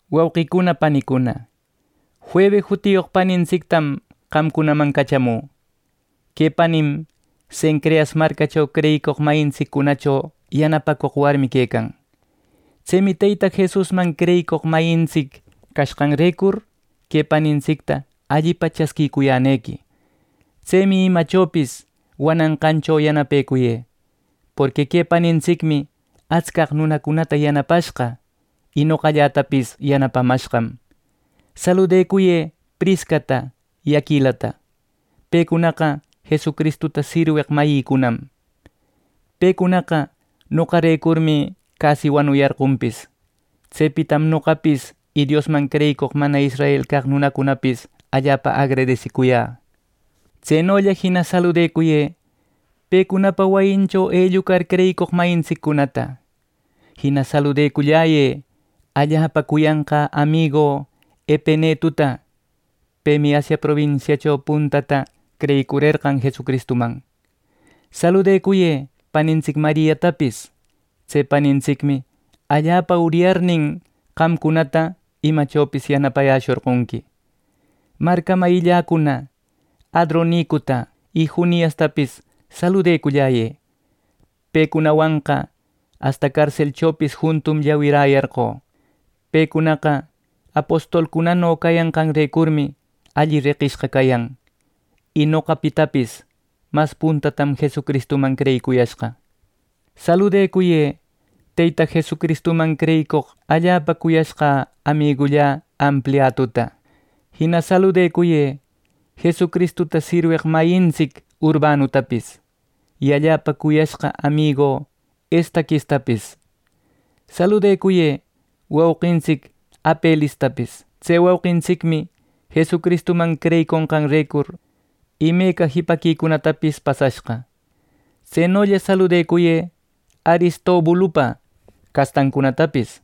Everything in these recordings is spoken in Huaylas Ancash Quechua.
Wauqicuna panicuna, Febe jutiyoq panintsictam qamcunaman cachamü. Que panim Cencreas marcacho creyicoq mayintsiccunacho yanapacoq warmi quecan. Tsemi Teyta Jesusman creyicoq mayintsic cashqanrecur que panintsicta allipa chasquicuyänequi. Tsemi imachopis wananqancho yanapecuyë; porqui que panintsicmi atscaq nunacunata yanapashqa, y noqallätapis yanapamashqam. Saluducuyë Priscata y Aquilata. Pecunaqa Jesucristuta sirweq mayïcunam. Pecunaqa noqarecurmi casi wanuyarqonpis. Tsepitam noqapis y Diosman creyicoq mana israel caq nunacunapis allapa agradesicuyä. Tsenolla jina saludacuyë pecunapa wayincho ellucar creyicoq mayintsiccunata. Jina saludecullayë allapa cuyanqä amigü Epenetuta. Pemi Asia probinsiacho puntata creyicurerqan Jesucristuman. Saluducuyë panintsic Mariatapis. Tse panintiscmi allapa uryarnin, qamcunata imachopis yanapayäshorqonqui. Marca mayilläcuna, Adronicuta y Juniastapis, saludeculläyë. Pecunawanqa asta carselchopis juntum llawiräyarqö. Pecunaqa apostolcunano cayanqanrecurmi alli reqishqa cayan, y noqapitapis mas puntatam Jesucristuman creyicuyashqa. Saluducuyë Teyta Jesucristuman creyicoq allapa cuyashqa amigullä Ampliatuta. Jina saludacuyë Jesucristuta sirweq mayintsic Urbanutapis, y allapa cuyashqa amigu Estaquistapis. Saluducuyë wauqintsic Apelestapis. Tse wauqintsicmi Jesucristuman creyiconqanrecur imeca jipaquicunatapis pasashqa. Tsenolla saludacuyë Aristobulupa castancunatapis.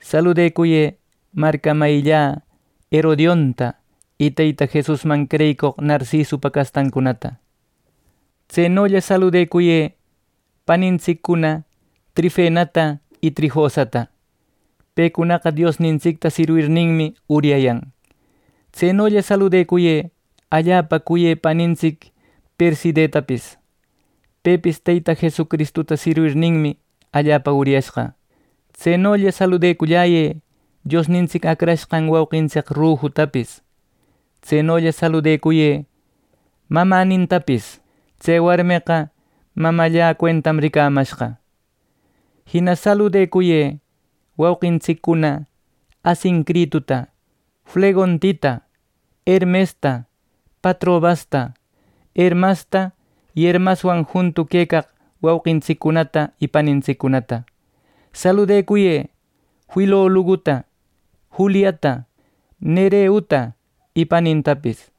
Saluducuyë marca mayillä Herodionta y Teyta Jesusman creyicoq Narcisupa castancunata. Tsenolla saludacuyë panintsiccuna Trifenata y Trifosata. Pecunaqa Diosnintsicta sirwirninmi uryayan. Tsenolla saludacuyë allapa cuyë panintsic Percidetapis. Pepis Teyta Jesucristuta sirwirninmi allapa uryashqa. Tsenolla saludeculläyë Diosnintsic acrashqan wauqintsic Rufutapis. Tsenolla saludacuyë mamänintapis. Tse warmeqa mamallä cuentam ricamashqa. Jina saludacuyë wauqintsiccuna Asincrituta, Flegontita, Hermesta, Patrobasta, Hermasta y Hermaswan juntu quecaq wauqintsicicunata y panintsiccunata. Saluducuyë Filologuta, Juliata, Nereuta y panintapis.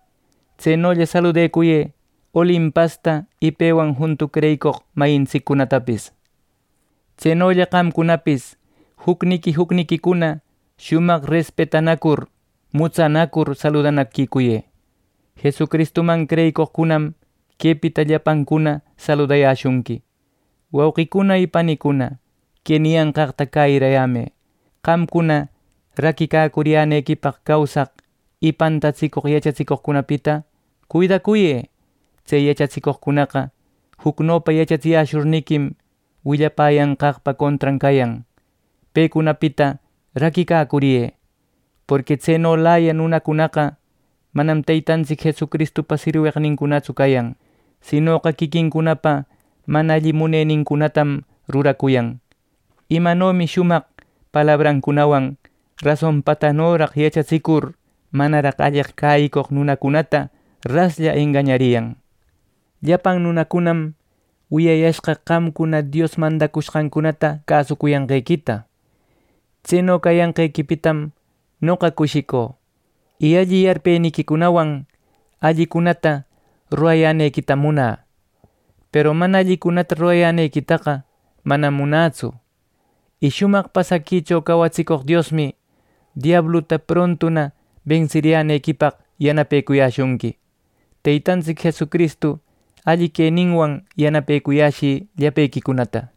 Tsenolla saludacuyë Olimpasta y pewan juntu creyicoq mayintsiccunatapis. Tsenolla qamcunapis jucniqui jucniquicuna shumaq respetanacur mutsanacur saludanaquicuyë. Jesucristuman creyicoqcunam quepita llapancuna saludayäshunqui. Wauqicuna y panicuna, que niyanqaqta cäyirayämë: Qamcuna raquicacuriyänequipaq causaq y pantatsicoq yachatsicoqcunapita cuidacuyë. Tse yachatsicoqcunaqa jucnopa yachatsiyäshurniquim, willapäyanqaqpa contran cayan. Pecunapita raquicacuriyë. Porqui tsenolaya nunacunaqa manam Teytantsic Jesucristupa sirweqnincunatsu cayan, sinoqa quiquincunapa mana alli munenincunatam ruracuyan. ¡Imanomi shumaq palabrancunawan rasonpatanoraq yachatsicur manaraq alleq cäyicoq nunacunata raslla engañariyan! Llapan nunacunam wiyayashqa qamcuna Dios mandacushqancunata cäsucuyanqequita. Tseno cayanqequipitam noqa cushicü y alli yarpeniquicunawan allicunata rurayänequitam munä; peru mana allicunata rurayänequitaqa manam munätsu. Y shumaq pasaquicho cawatsicoq Diosmi diabluta prontuna bensiriyänequipaq yanapecuyäshunqui. Teytantsic Jesucristu alli queninwan yanapecuyäshï llapequicunata.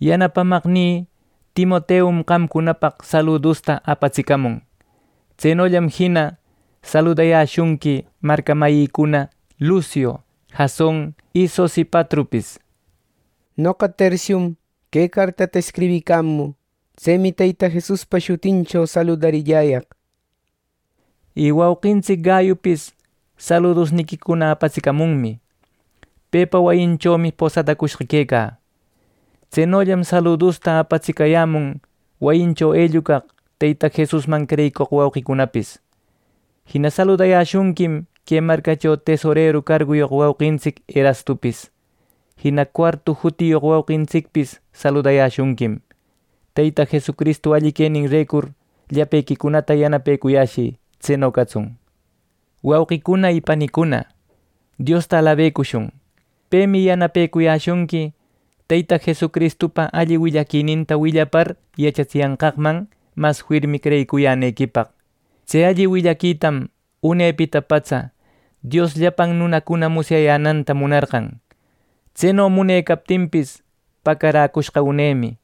Yanapamaqnï Timoteum qamcunapaq saludusta apatsicamun. Tsenollam jina saludayäshunqui marca mayïcuna Luciu, Jason y Sosipatropis. Noqa, Tercium, que cartata escribicamü. Tsemi Teyta Jesuspa shutincho saludarilläyaq. Y wauqintsic Gayupis saludusniquicuna apatsicamunmi. Pepa wayinchomi posadacushqa quecä. Tsenollam saludusta apatsicayämun wayincho ellucaq Teyta Jesusman creyicoq wauqicunapis. Jina saludäyäshunquim que marcacho tesoreru carguyoq wauqintsic Erastupis. Jina Cuartu jutiyoq wauqintsicpis saludayäshunquim. ˻Teyta Jesucristu alli queninrecur llapequicunata yanapecuyäshï. Tseno catsun.˼ Wauqicuna y panicuna, Diosta alabecushun. Pemi yanapecuyäshunqui Teyta Jesucristupa alli willaquininta willapar yachatsiyanqaqman mas firmi creyicuyänequipaq. Tse alli willaquitam unepita patsa Dios llapan nunacuna musyayänanta munarqan; tseno munecaptinpis, pacaräcushqa unemi.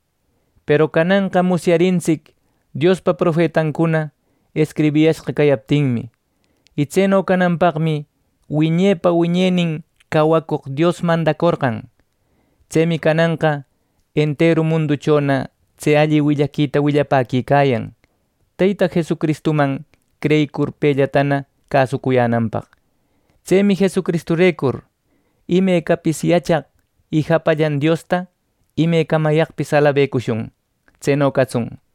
Peru cananqa musyarintsic Diospa profetancuna escribiyashqa cayaptinmi. Y tseno cananpaqmi wiñepa wiñenin cawacoq Dios mandacorqan. Tsemi cananqa enteru munduchona tse alli willaquita willapäquicayan Teyta Jesucristuman creyicur pellatana cäsucuyänanpaq. Tsemi Jesucristurecur imecapis yachaq y japallan Diosta imecamayaqpis alabecushun. ¡Tseno catsun!